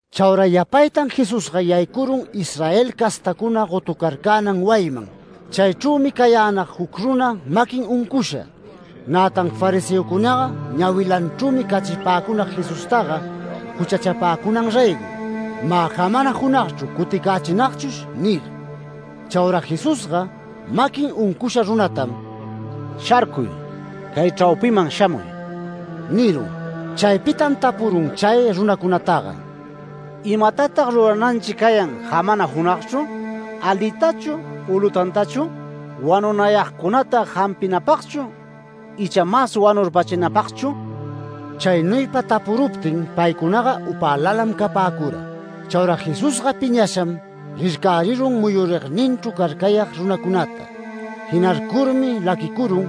Chaura yapaytan Jesusga yaycurun Israel castacuna gotucarcänan wayiman. Chaychrümi cayänag juc runa maquin uncusha. Nätan fariseocunaga ñawilanchrümi cachipäcunag Jesustaga juchachapäcunan raygo “Mä jamana junagchru cuticächinagchush” nir. Chaura Jesusga maquin uncusha runatam “¡Sharcuy! ¡Cay chraupiman shamuy!” nirun. Chaypitam tapurun chay runacunataga: “¿Imatatag rurananchi cayan jamana junagchru? ¿Alitachu u lutantachu? ¿Wanunayagcunata jampinapagchu icha mas wanurpachinapagchu?” Chaynuypa tapuruptin paycunaga upälalam capäcura. Chaura Jesusga piñasham rircärirun muyurigninchru carcayag runacunata. Jinarcurmi laquicurun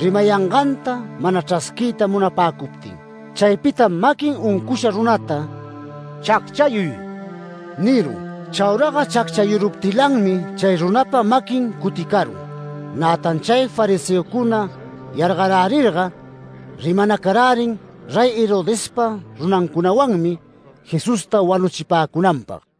rimayanganta mana chrasquiyta munapäcuptin. Chaypitam maquin uncusha runata “¡Chacchayuy!” nirun. Chauraga chacchayuruptilanmi chay runapa maquin cuticarun. Nätan chay fariseocuna yargarärirga rimanacarärin Rey Herodespa runancunawanmi Jesusta wanuchipäcunanpag.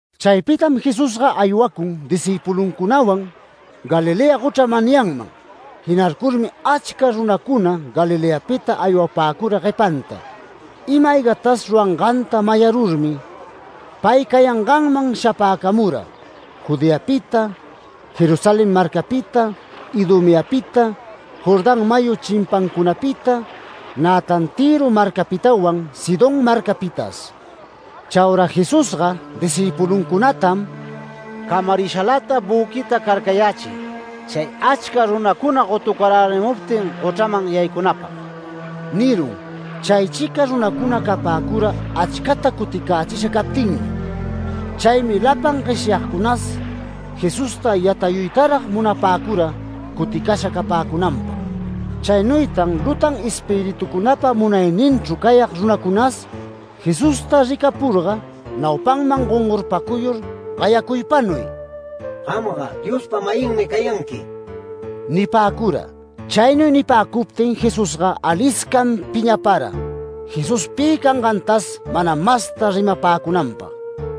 Chaypitam Jesusga aywacun discïpuluncunawan Galilea gochra manyanman. Jinarcurmi achca runacuna Galileapita aywapäcura guepanta. Ima-aygatas ruranganta mayarurmi, pay cayanganman shapäcamura, Judeapita, Jerusalén marcapita, Idumeapita, Jordán mayu chimpancunapita, nätan Tïro marcapitawan, Sidón marcapitas. Chaura Jesusga discïpuluncunatam “Camarishalata büquita carcayächiy, chay achca runacuna gotucarärimuptin gochraman yaycunäpag” nirun. Chaychica runacuna capäcura achcata cuticächisha captinmi. Chaymi lapan gueshyagcunas Jesusta yatayuytarag munapäcura cuticasha capäcunanpag. Chaynuytan lutan espiritucunapa munayninchru cayag runacunas Jesusta ricapurga naupanman gongorpacuyur, gayacuypanuy: “Gamga Diospa-mayinmi cayanqui” nipäcura. Chaynuy nipäcuptin Jesusga aliscam piñapara, Jesús pi cangantas mana masta rimapäcunanpag.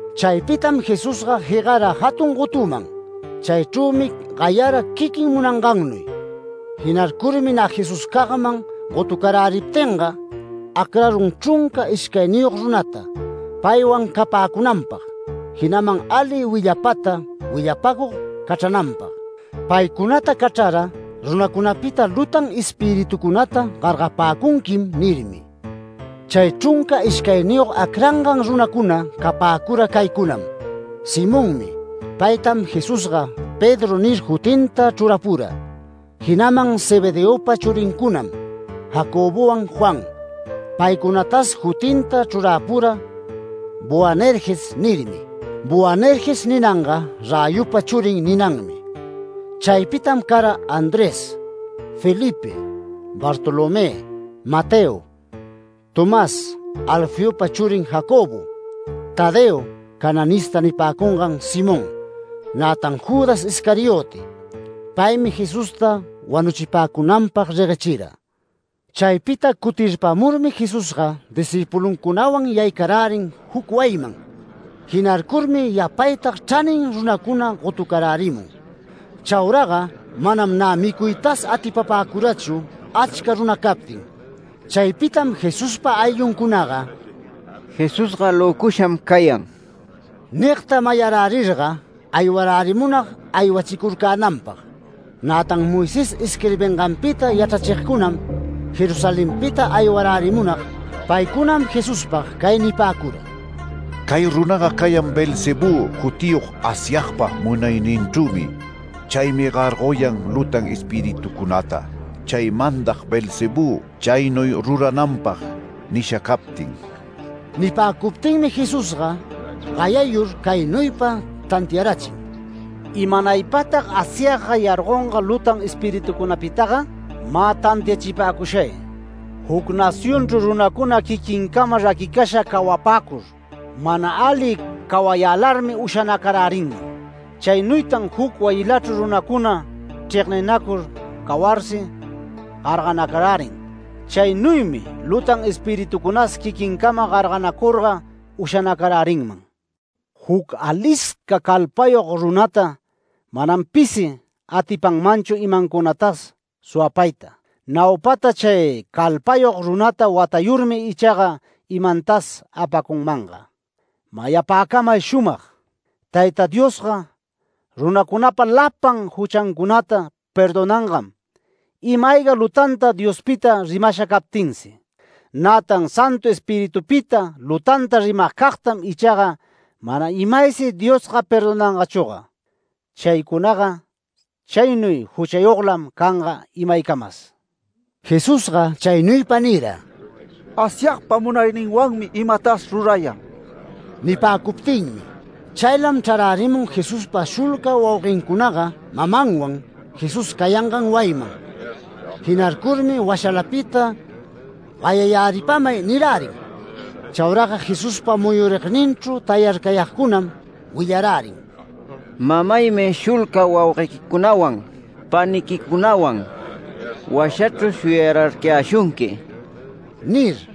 Chaypitam Jesusga jegara jatun gotuman. Chaychrümi gayara quiquin munangannuy. Jinarcurmi nä Jesuscagman gotucaräriptinga, acrarun chrunca ishcayniyog runata, paywan capäcunanpag, jinaman ali willapata willapäcug cachrananpag. Paycunata cachrara “Runacunapita lutan espiritucunata gargapäcunquim” nirmi. Chay chrunca ishcayniyog acrangan runacuna capäcura caycunam: Simonmi, paytam Jesusga ‘Pedro’ nir jutinta chrurapura. Jinaman Zebedeopa churincunam, Jacobowan Juan. Paycunatas jutinta chrurapura ‘Boanerges’ nirmi. ‘Boanerges’ ninanga ‘Räyupa churi’ ninanmi. Chaypitam cara, Andrés, Felipe, Bartolomé, Mateo, Tomás, Alfeopa churin Jacobo, Tadeo, ‘Cananista’ nipäcungan Simón, nätan Judas Iscariote. Paymi Jesusta wanuchipäcunanpag reguechira. Chaypita cutirpamurmi Jesusga discïpuluncunawan yaycarärin juc wayiman. Jinarcurmi yapaytag chranin runacuna gotucarärimun. Chauraga manam nä micuytas atipapäcurachu achca runa captin. Chaypitam Jesuspa aylluncunaga “Jesusga löcusham cayan” nigta mayarärirga aywarärimunag aywachicurcänanpag. Nätan Moisés isquirbinganpita yachrachigcunam Jerusalenpita aywarärimunag, paycunam Jesuspag cay nipäcura: “Cay runaga cayan Beelzebú jutiyog Asyagpa munayninchrümi. Chaymi gargoyan lutan espiritucunata, chay mandag Beelzebú chaynuy rurananpag nisha captin”. Nipäcuptinmi Jesusga gayayur caynuypa tantiarachin: “¿Imanaypatag Asyagga gargonga lutan espiritucunataga? Mä tantiachipäcushay: Juc nacionchru runacuna quiquincama raquicasha cawapäcur, mana ali cawayälarmi ushanacarärinman. Chaynuytan juc wayilachru runacuna chregninacur cawarsi, garganacarärin. Chaynuymi lutan espiritucunas quiquincama garganacurga ushanacarärinman. Juc alisca calpayog runata manam pisi atipanmanchu imancunatas suwapayta, naupata chay calpayog runata watayurmi ichaga imantas apacunmanga. Mayapäcamay shumag: Tayta Diosga runacunapa lapan juchancunata perdonangam, ima-ayga lutanta Diospita rimasha captinsi. Nätan Santu Espiritupita lutanta rimagcagtam ichaga mana imaysi Diosga perdonangachüga. Chaycunaga chaynuy juchayoglam canga imaycamas”. Jesusga chaynuypa nira, “Asyagpa munayninwanmi imatas rurayan” nipäcuptinmi. Chaylam chrarärimun Jesuspa shulca wauguencunaga mamanwan Jesús cayangan wayiman. Jinarcurmi washalapita “Gayayäripamay” nirärin. Chauraga Jesuspa muyurigninchru tayarcayagcunam willarärin: “Mamaymi shulca wauguequicunawan paniquicunawan washachru shuyararcayäshunqui” nir.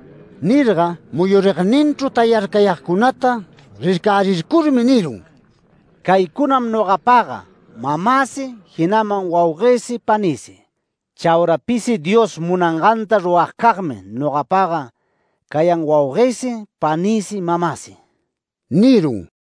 Nirga muyurigninchru tayarcayagcunata rircärircurmi nirun: “Caycunam nogapaga mamäsi, jinaman wauguësi panïsi. Chaura pisi Dios munanganta ruragcagmi nogapaga cayan wauguësi panïsi mamäsi” nirun.